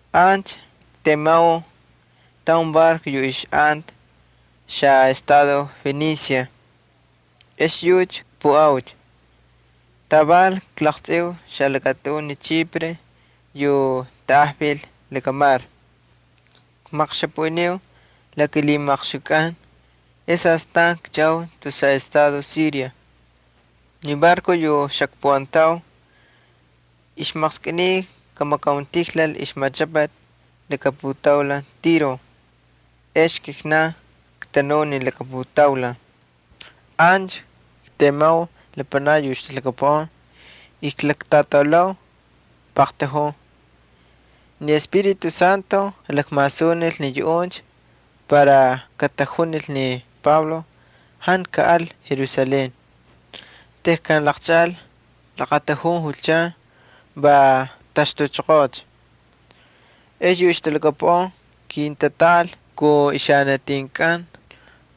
Ancha ktemau taun barco yu ixꞌanta xaꞌestado Fenicia, ex yucha kpuꞌaucha. Taval klaqtsꞌiu xalakatꞌun ni Chipre yu tanꞌajvil lakamar, kmaqxapaꞌiniu la kilhijamaqxukꞌan ex astan kchaꞌau tus xaꞌestado Siria. Ni barco yu xakpuꞌantau ixmaqskꞌiniy kamakauntijlal ixmachꞌapati laka putaulan Tiro, ex kijnan ktanuu ni laka putaulan. Ancha ktemau lapanakni yu ixtalhakapuꞌan y klaktꞌataulau paqtujun. Ni Espíritu Santo jalakmasunil ni yuꞌuncha para katajunil ni Pablo jantu kaꞌal Jerusalén. Tejkan laqchaꞌal laqatujun julchan va ktaxtuchoqoocha. Ex yu ixtalhakapuꞌan kintatꞌaꞌal kun ixanatinkꞌan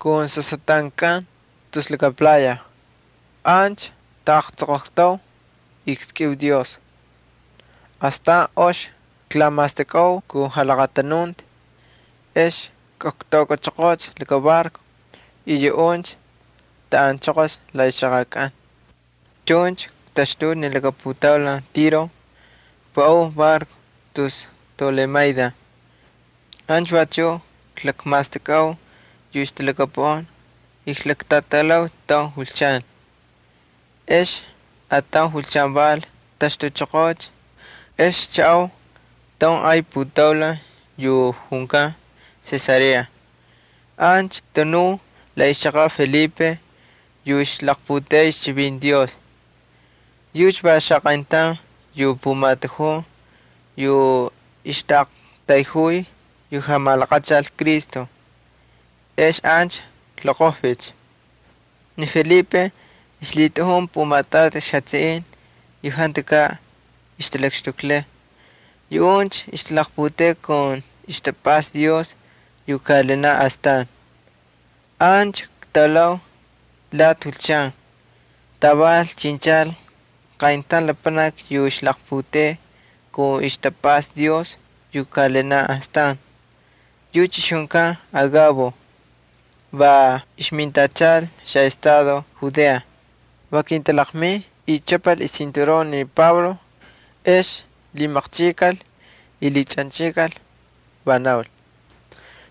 ali sasꞌatꞌankꞌan tus laka playa. Ancha ktaꞌaqtsoqoqtau y kskꞌiu Dios. Astan ox klamastakꞌau kun jalaqatanunti ex ktaukꞌachoqoocha laka barco y yuꞌuncha taꞌanchoqol la ixchaqakꞌan. Chuncha ktaxtuucha ni laka putaulan Tiro, kpuꞌau barco tus Tolemaida. Ancha vachuꞌ klakmastakꞌau yu ixtalhakapuꞌan y klaktꞌataulau taun julchan. Ex ataun julchan val ktaxtuchoqoocha, ex kchaꞌau taun ay putaulan yu junkan Cesarea. Ancha ktanuu la ixchaqaꞌ Felipe yu ixlaqputeꞌey ixchivinti Dios. Yucha va xaqayntaun yu pumatujun yu ixtaꞌaqtayjuy yu jamalaqachal Cristo. Ex ancha kloqojvicha. Ni Felipe ixlhitꞌajun pumatꞌati ixjatsiꞌin yu jantukaꞌ ixtalakxtuklay. Yuꞌuncha ixtalaqputeꞌey kun ixtapꞌasta Dios yu kaꞌalinaꞌ astan. Ancha ktaulau lati julchan, taval chinchal qayntaun lapanaki yu ixlaqputeꞌey kun ixtapꞌasta Dios yu kaꞌalinaꞌ astan. Yucha ixjunkan Agabo va ixmintachal xaꞌestado Judea. Va kintalaqmin y chꞌapal ixcinturon ni Pablo, ex lhimaqchꞌikal y lhichꞌanchꞌikal, va naul: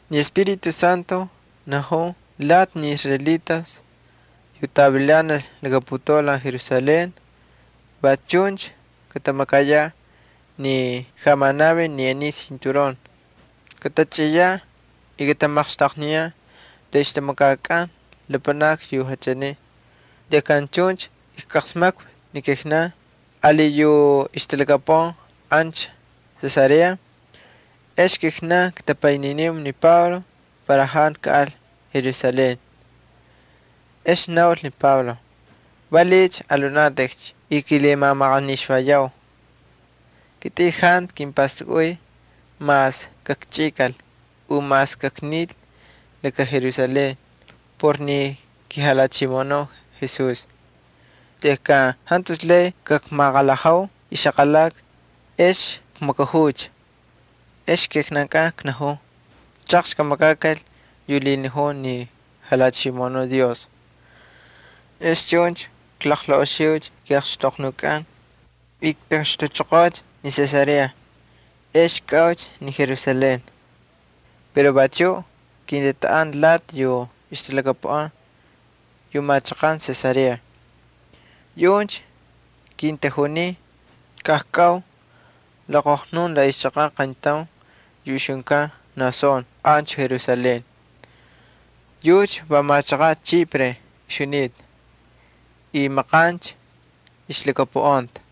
—Ni Espíritu Santo najun lati ni israelitas yu tavilanal laka putaulan Jerusalén va chuncha katamakayaꞌ ni jamanavin ni aniy cinturón. Katachꞌiyaꞌ y katamaqxtaqniyaꞌ la ixtamakkꞌan lapanakni yu jantu israelitas kataval Tejkan chuncha ijqasmakvi ni kijnankꞌan ali yu ixtalhakapuꞌan ancha Cesarea, ex kijnan ktapayniniu ni Pablo para jantu kaꞌal Jerusalén. Ex naul ni Pablo: —¿Valiꞌiycha alhunatꞌikcha y kilamamaqanixvayau? Kitꞌin jantu kimpastakꞌuy mas kakchꞌikal u mas kaknil laka Jerusalén por kiJalhachimoꞌonuꞌ Jesús. Tejkan jantucha lay kakmaqalhajau ixaqalaka, ex kmakajuucha, va knajuu: —Chaqxi kamakakal yu lhinajun ni Jalhachimoꞌonuꞌ Dios. Ex chuncha klaqlaꞌoxiucha kiꞌaxtoqnukꞌan, ktaxtuchoqoocha ni Cesarea, ex kꞌaucha ni Jerusalén. Pero vachuꞌ kintatꞌaꞌan lati yu ixtalhakapuꞌan yu machaqan Cesarea. Yuꞌuncha kintajunin kajkꞌau loqojnun la ixchaqaꞌ qayntaun yu ixjunkan Mnasón ancha Jerusalén. Yucha va machaqaꞌ Chipre ixjunita y maqancha ixlhakapuꞌanta.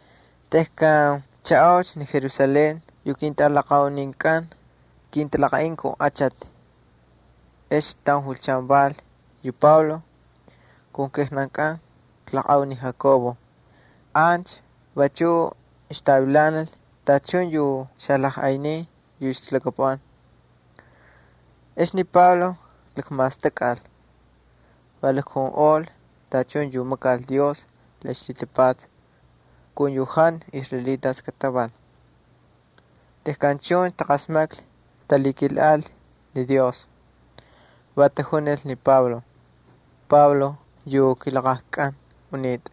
Tejkan kchaꞌaucha Jerusalén yu ketꞌalaqauninkꞌan kintalaqaꞌin kun achati. Ex ataun julchan val yu Pablo kun kijnankꞌan klaqꞌau ni Jacobo. Ancha vachuꞌ ixtavilanal tachun yu xalajꞌaynin yu ixtalhakapuꞌan. Ex ni Pablo lakmastakꞌal, va jalakjunꞌol tachun yu makal Dios la ixlhitapatsa kun yu jantu israelitas kataval. Tejkan chuncha taqasmaklhi ay tamakal ni Dios. Va tajunil ni Pablo: —Pablo yu kilaqajkꞌan unitꞌa,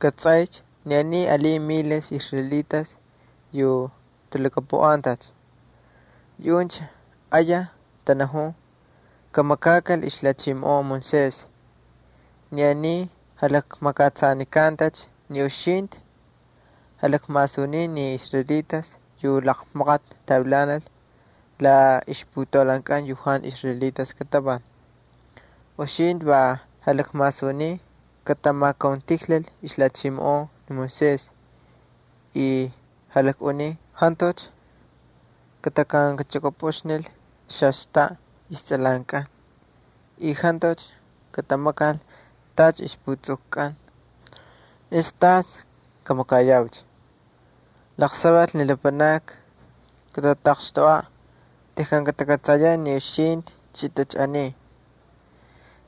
kꞌatsꞌaycha ni aniy alin miles israelitas yu talhakapuꞌantacha. Yuꞌuncha ayaj tanajun kamakakal ixlhachimoꞌon Moisés. Ni aniy jamakꞌatsanikantacha ni uxintꞌi jalakmasuniy ni israelitas yu laqmaqati tavilanal la ixputaulankꞌan yu jantu israelitas kataval. Uxintꞌi va jalakmasuniy katamakauntijlal ixlhachimoꞌon Moisés y jalakꞌuniy jantucha kataxvililichukꞌupꞌuxnil istsꞌalankꞌan y jantucha katamakal tacha ixputsukukꞌan. ¿Ex tas kamakayaucha? Laqsaval ni lapanakni katataqxtoꞌaꞌ tejkan katakꞌatsayaꞌ ni uxintꞌi chꞌitꞌa aniy.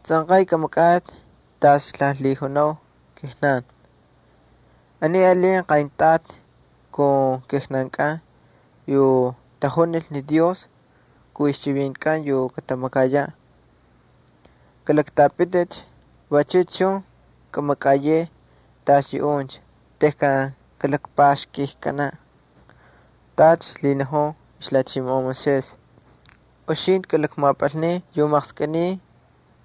Tsꞌanqay kꞌamakꞌatꞌi tacha klalhijunau kijnan: Aniy alin qayntꞌati kun kijnankꞌan yu tajunil ni Dios kun ixchivintikꞌan yu katamakayaꞌ. Kalaktꞌapiticha, vachu chun kꞌamakꞌayeꞌe tacha yuꞌuncha tejkan kalakpaxkꞌikkanaꞌ tacha lhinajun ixlhachimoꞌon Moisés. Uxintꞌi kalakmapꞌalnin yu maqskꞌiniy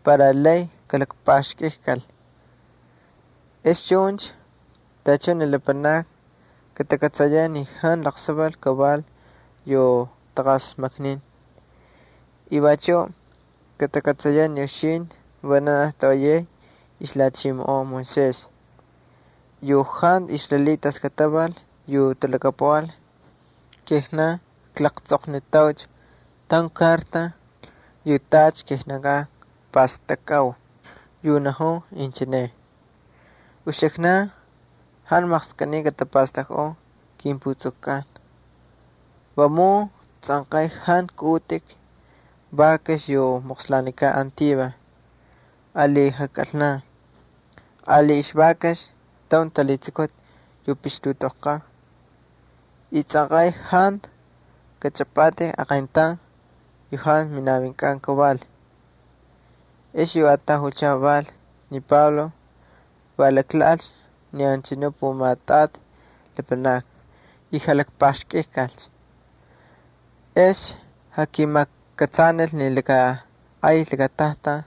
para lay kalakpaxkꞌikkal. Ex chuncha tachun ni lapanakni katakꞌatsayaꞌ ni jantu laqsaval kaval yu taqasmaknin. Vachuꞌ katakꞌatsayaꞌ ni uxintꞌi vananaj toꞌoyay ixlhachimoꞌon Moisés. Yu jantu israelitas kataval yu talhakapuꞌan, kijnan klaqtsꞌoqnitaucha taun karta yu tacha kijnankꞌan kpastakꞌau yu najun inchine: Uxiknan jantu maqskꞌiniy katapastakꞌun kimputsukkꞌan. Vamun tsꞌanqay jantu kꞌaꞌutꞌik vakax yu moqslanikan antivas, ali jakꞌalna, ali ixvakax taun talhitsukuti yu pixtutꞌoqlkan, y tsꞌanqay jantu katꞌatꞌamatꞌik aqayntaun yu jantu minavinkꞌan kaval. Ex yu ataun julchan val ni Pablo va laklhaꞌalcha ni anchanu pumatꞌati lapanakni y jalakpaxkꞌikkal. Ex jakimakꞌatsanil ni laka ay lakatajtan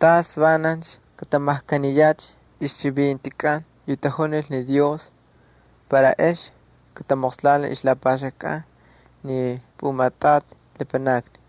tas vanancha katamajkaniyaꞌ ixchivintikꞌan yu tajunil ni Dios para ex katamoqslanil ixlapaxkankꞌan ni pumatꞌati lapanakni.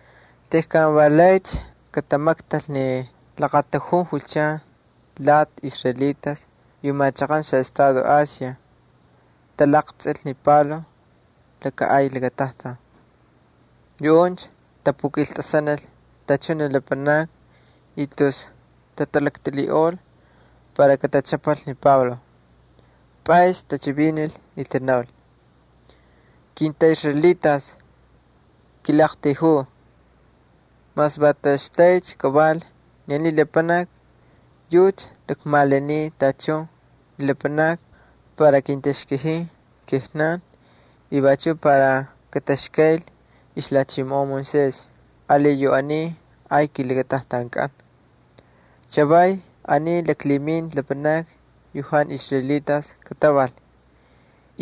Tejkan va laycha katamaktal ni laqatujun julchan lati israelitas yu machaqan xaꞌestado Asia talaqtsꞌil ni Pablo laka ay lakatajtan. Yuꞌuncha tapukiltꞌasanil tachun ni lapanakni y tus tatalaktꞌilhiꞌol para katachꞌapal ni Pablo. Pꞌays tachivinil y tanaul: —Kintꞌaꞌisraelitas, kilaꞌaqtayjuu. Mas va toꞌoxtaycha kaval ni aniy lapanaki yucha lakmalaniy tachun ni lapanakni para kintaxkajin kijnan y vachuꞌ para kataxkayl ixlhachimoꞌon Moisés ali yu aniy ay kilakatajtankꞌan. Chavaycha aniy laklhiminta lapanakni yu jantu israelitas kataval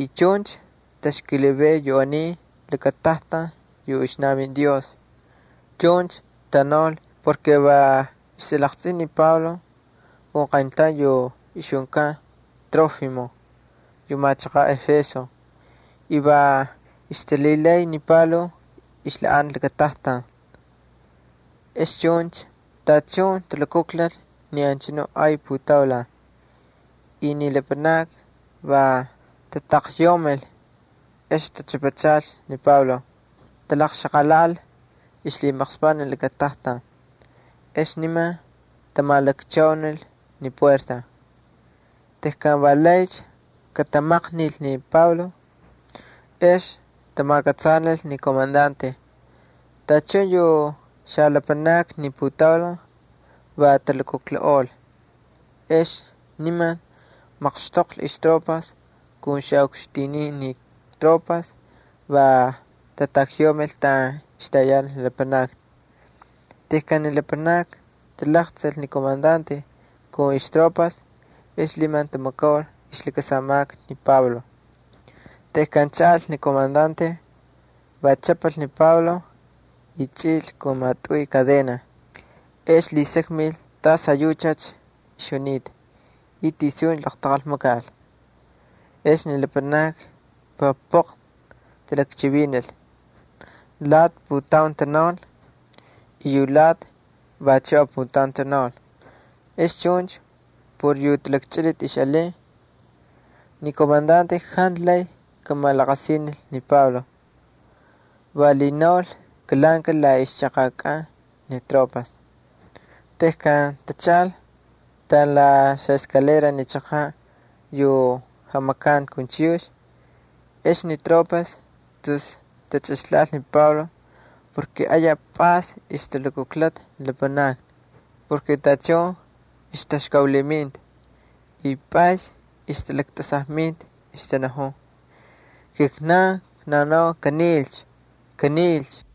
y chuncha taxkilivay yu aniy lakatajtan yu ixnavin Dios. Chuncha tanaul porke va ixtalaqtsꞌinta ni Pablo kun qayntaun yu ixjunkan Trófimo yu machaqaꞌ Éfeso y va ixtalhilay ni Pablo ixlhaꞌanta lakatajtan. Ex chuncha tachun talukujlal ni anchanu ay putaulan y ni lapanakni va tatakyaumil, ex tachꞌapachalcha ni Pablo, talaqxaqalhaꞌal ixlhimaqspaꞌ ni lakatajtan, ex niman tamalakchaunil ni xapuertas. Tejkan valaycha katamaqnil ni Pablo ex tamakꞌatsanil ni komandante tachun yu xalapanakni ni putaulan va talukujlaꞌol. Ex niman laqmaqxtoqlhi ixtropas ali xaꞌukxtinin ni tropas, va tatakyaumil taꞌan ixtayanal ni lapanakni. Tejkan ni lapanakni talaqtsꞌil ni komandante kun ixtropas ex niman tamakaul ixlakasamaka ni Pablo. Tejkan chaꞌal ni komandante, va chꞌapal ni Pablo, y chꞌil kun maꞌatꞌuy kadenas. Ex lhisakmil tas ayuchacha ixjunita y tisuncha laqtaqal makal. Ex ni lapanakni va poql talakchivinil. Lati putaun tanaul, y yu alati vachuꞌ aputaun tanaul. Ex chuncha por yu talakchꞌiliti ixꞌalin, ni komandante jantu lay kamalaqasinil ni Pablo. Va lhinaul kalhaꞌankal la ixchaqakꞌan ni tropas. Tejkan tachaꞌal taꞌan la xaskalera ni chaqaꞌ yu jamakanti kun chiyux, ex ni tropas tus tachꞌixlhaꞌal ni Pablo porke ayaj pꞌays ixtalukujlata ni lapanakni. Tachun ixtaxkaulhiminta y pꞌays ixtalaktꞌasajminta, ixtanajun: —¡Kijnan knaunau kanilcha! ¡Kanilcha!